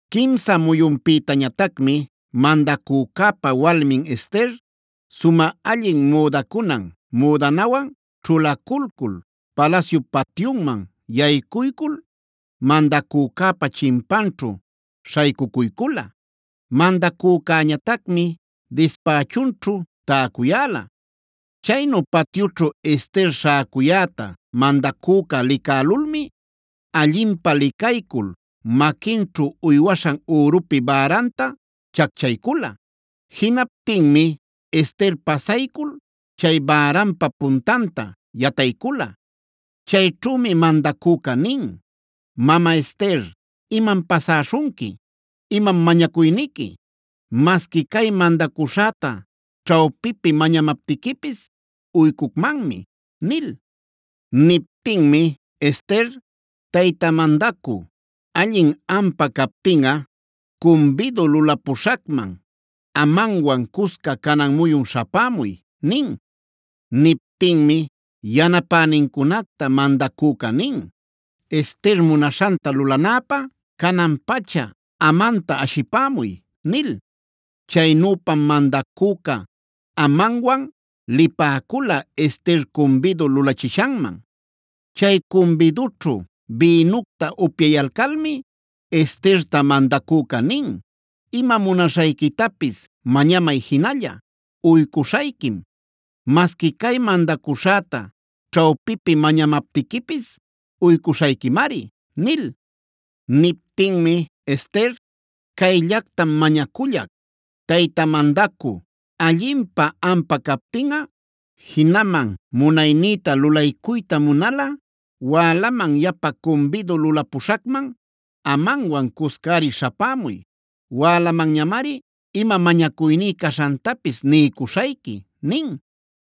Quimsa muyunpïtañatacmi mandacücäpa walmin Ester, sumä allin müdacunan müdanawan ćhulaculcul, palasyup patyunman yaycuycul mandacücäpa chimpanćhu śhaycucuycula. Mandacücäñatacmi dispächunćhu täcuyäla. Chaynu patyućhu Ester śhäcuyäta mandacüca licälulmi, allinpä licaycul maquinćhu uywaśhan ürupi bäranta chacchaycula. Jinaptinmi Ester pasaycul chay bäranpa puntanta yataycula. Chayćhümi mandacüca nin: “Mama Ester, ¿imam pasäśhunqui? ¿Imam mañacuyniqui? Masqui cay mandacuśhäta ćhawpipi mañamaptiquipis uycucmanmi” nil. Niptinmi Ester: “Tayta mandacü, allin ampä captinꞌa cumbidu lulapuśhacman Amanwan cusca canan muyun śhapämuy” nin. Niptinmi yanapänincunacta mandacüca nin: “Ester munaśhanta lulanäpä, canan-pacha Amanta ashipämuy” nil. Chaynüpam mandacüca Amanwan lipäcula Ester cumbidu lulachishanman. Chay cumbidućhu bïnucta upyayalcalmi Esterta mandacüca nin: “Ima munaśhayquitapis mañamay jinalla, uycuśhayquim. Masqui cay mandacuśhäta ćhawpipi mañamaptiquipis uycuśhayquimari” nil. Niptinmi Ester: “Cayllactam mañacullac: Tayta mandacü, allinpä ampä captinꞌa, jinaman munaynïta lulaycuyta munalꞌa wälaman yapa cumbidu lulapuśhacman Amanwan cuscari śhapämuy. Wälamanñamari ima mañacuyní caśhantapis niycuśhayqui” nin.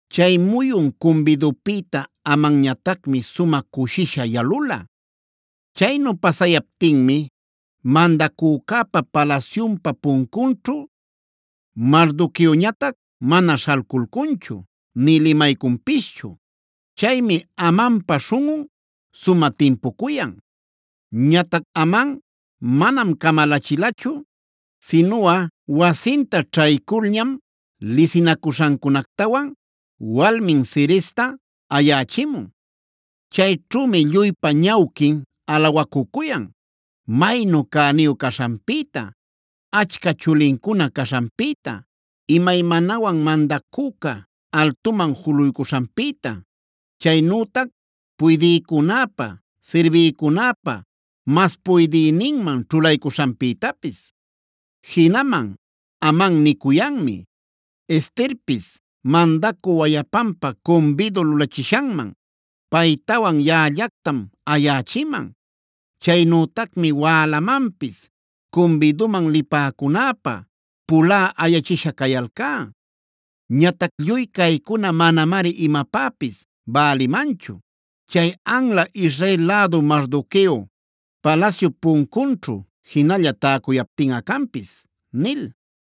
Chay muyun cumbidupïta Amanñatacmi sumä cushisha yalula. Chaynu pasayaptinmi mandacücäpa palasyunpa puncunćhu Mardoqueoñatac mana śhalculcunchu nï limaycunpischu. Chaymi Amanpa śhunꞌun sumä timpucuyan. Ñatac Aman manam camalachilachu, sinuꞌa wasinta ćhayculñam lisinacuśhancunactawan walmin Zeresta ayächimun. Chayćhümi lluypa ñawquin alawacucuyan maynu cäniyu caśhanpïta, achca chulincuna caśhanpïta, imaymanawan mandacüca altuman juluycuśhanpïta, chaynütac puydïcunäpa sirbïcunäpa mas puydïninman ćhulaycuśhanpïtapis. Jinaman Aman nicuyanmi: “Esterpis, mandacü wayapanpä cumbidu lulachishanman paytawan yaꞌallactam ayächiman. Chaynütacmi wälamanpis cumbiduman lipäcunäpä pulä ayachisha cayalcá. Ñatac lluy caycuna manamari imapäpis bälimanchu chay anla Israel lädu Mardoqueo palasyup puncunćhu jinalla täcuyaptinꞌa canpis” nil.